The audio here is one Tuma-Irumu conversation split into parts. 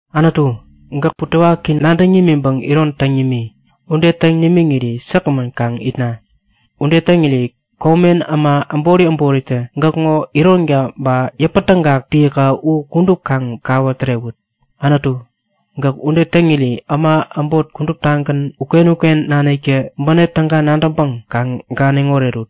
Anutu, gäk butewaki nadäŋ nimiŋpäŋ iron täŋ nimi. Ude täŋ nimiŋiri säkgämän kaŋ itna! Ude täŋiri komen äma äbori äboritä gäkŋo ironka ba yäpätägak piäka u kudup kaŋ kawä tärewut. Anutu, gäk ude täŋiri äma äbot kuduptagän uken-uken naniktä bänep täga nadäŋpäŋ kaŋ ganiŋ orerut.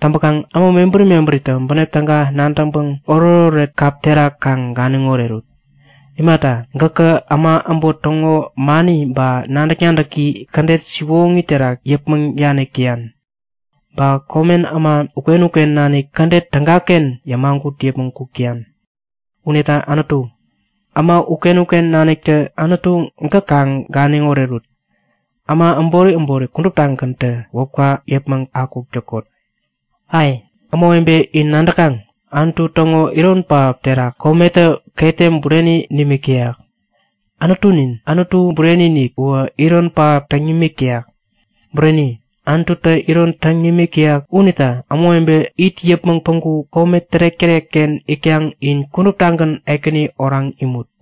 Täŋpäkaŋ äma mebäri mebäritä bänep täga nadäŋpäŋ oretoret kap terak kaŋ ganiŋ orerut. Imata, gäkä äma äbot täŋo mani ba nadäk-nadäki kädet siwoŋi terak yäpmäŋ danik täyan. Ba komen äma uken-uken nanik kädet tägaken yämagut yäpmäŋ kuk täyan. Unita Anutu, äma uken-uken naniktä Anutu gäk kaŋ ganiŋ orerut. Äma äbori äbori kuduptagäntä wäpka yäpmäŋ akuk täkot! Ai, ämawebe, in nadäkaŋ? Anutu täŋo iron pähap terak kometä ketem bureni nimik täyak. Anutunin, Anutu Bureni-inik uwä iron pähap täŋ nimik täyak. Bureni! Anututä iron täŋ nimik täyak unita ämawebe it yäpmäŋ päŋku kome tärek-tärekken itkaŋ in kuduptagän Ekäni oraŋ imut!